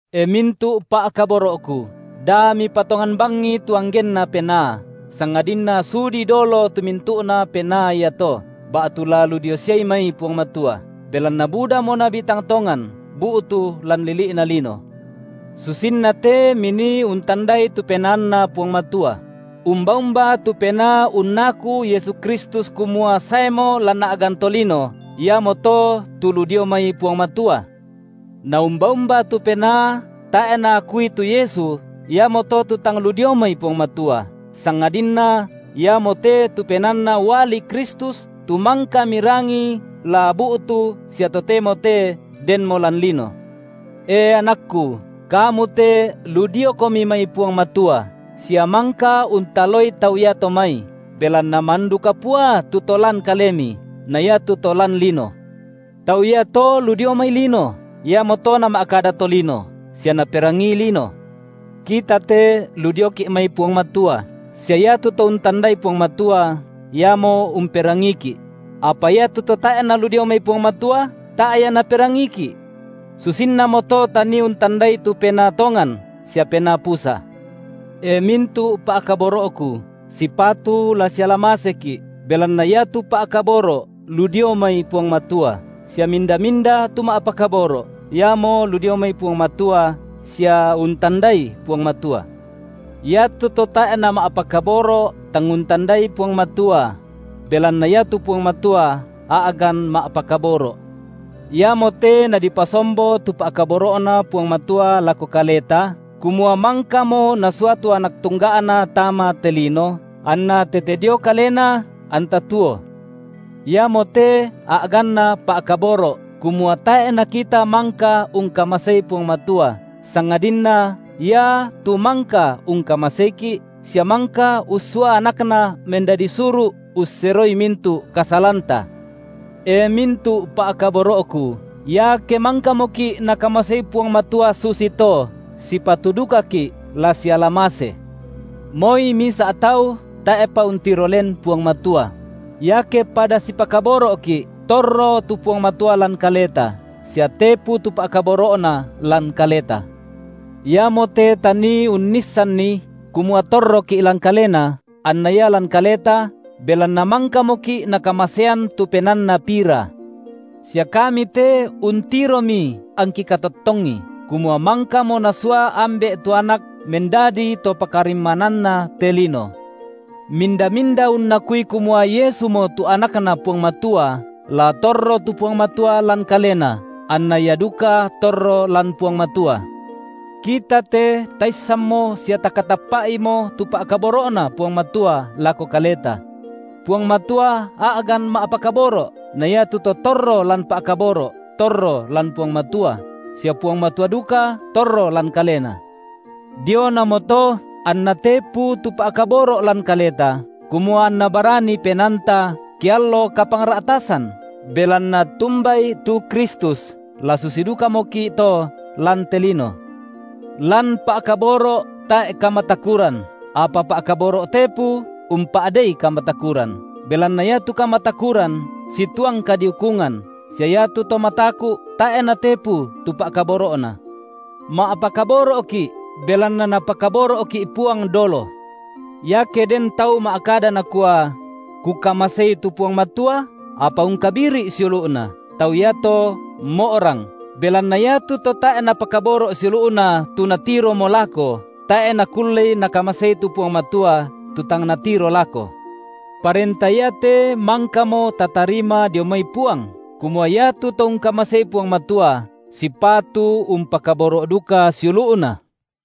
E mintu’ pa’kaboro’ku, da mipatongan bangi tu anggenna penaa, sangadinna sudi dolo tu mintu’na penaa iato, ba’tu la lu dio siai mai Puang Matua; belanna budamo nabi tang tongan bu’tu lan lili’na lino. Susinna te minii untandai tu PenaanNa Puang Matua; umba-umba tu penaa unnaku Yesu Kristus kumua saemo lan a’gan tolino, iamoto tu lu dio mai Puang Matua; na umba-umba tu penaa, tae’ naakui tu Yesu, iamoto tu tang lu dio mai Puang Matua, sangadinna iamote tu penaanna uali Kristus tu mangka mirangi la bu’tu sia totemo te denmo lan lino. E anakku, kamu te lu diokomi mai Puang Matua sia mangka untaloi tau iato mai, belanna mandu kapua tu To lan kalemi na iatu to lan lino. Tau iato lu dio mai lino, iamoto nama’kada tolino, sia naperangii lino. Kita te lu dioki’ mai Puang Matua; sia iatu to untandai Puang Matua, iamo umperangiiki’; apa iatu to tae’ nalu dio mai Puang Matua, tae’ ia naperangiiki’. Susinnamoto tanii untandai tu penaa tongan sia penaa pusa. E mintu’ pa’kaboro’ku, sipatu la siala maseki’, belanna iatu pa’kaboro’ lu dio mai Puang Matua, sia minda-minda tu ma’pakaboro’, iamo lu dio mai Puang Matua sia untandai Puang Matua. Iatu to tae’ nama’pakaboro’, tang untandai Puang Matua; belanna iatu Puang Matua a’gan ma’pakaboro’. Iamote nadipasombo tu pa’kaboro’Na Puang Matua lako kaleta, kumua mangkamo Nasua tu Anak tungga’Na tama te lino, anna tete dio Kalena anta tuo. Iamote a’ganna pa’kaboro’, kumua tae’ nakita mangka ungkamasei Puang Matua, sangadinna Ia tu mangka ungkamaseiki’, sia mangka ussua AnakNa mendadi suru’ usseroi mintu’ kasalanta. E mintu’ pa’kaboro’ku, iake mangkamoki’ Nakamasei Puang Matua susito, sipatu dukaki’ la siala mase. Moi misa’ tau tae’pa untiro len Puang Matua; iake pada sipakaboro’ki’, torro tu Puang Matua lan kaleta, sia tepu tu pa’kaboro’Na lan kaleta. Iamote tanii unnissanni kumua torroki’ lan Kalena, anna Ia lan kaleta, belanna mangkamoki’ Nakamasean tu PenaanNa pira. Sia kami te untiromi angki katottongi, kumua mangkamo Nasua Ambe’ tu Anak mendadi To pakarimmananna te lino. Minda-minda unnakui kumua Yesumo tu AnakNa Puang Matua, la torro tu Puang Matua lan kalena anna ia duka torro lan Puang Matua. Kita te taissanmo sia takatappa’imo tu pa’kaboro’Na Puang Matua lako kaleta. Puang Matua a’gan ma’pakaboro’, na iatu to torro lan pa’kaboro’ torro lan Puang Matua, sia Puang Matua duka torro lan kalena. Dionamoto anna tepu tu pa’kaboro’ lan kaleta, kumua anna barani penaanta, ke allo kapangra’tasan, belanna tumbai tu Kristus, la susi dukamoki’ to lan te lino. Lan pa’kaboro’ tae’ kamatakuran, apa pa’kaboro’ tepu umpa’dei kamatakuran, belanna iatu kamatakuran situang kadiukungan, sia iatu to mataku’ tae’ natepu tu pa’kaboro’na. Ma’pakaboro’ki’, belanna Napakaboro’ki’ Puang dolo. Iake den tau ma’kada nakua: Kukamasei tu Puang Matua, apa ungkabiri’ siulu’na, tau iato mo’rang, belanna iatu to tae’ napakaboro’ siulu’na tu natiromo lako, tae’ nakullei nakamasei tu Puang Matua, tu tang natiro lako. Parenta iate mangkamo tatarima dio mai Puang, kumua iatu to ungkamasei Puang Matua, sipatu umpakaboro’ duka siulu’na.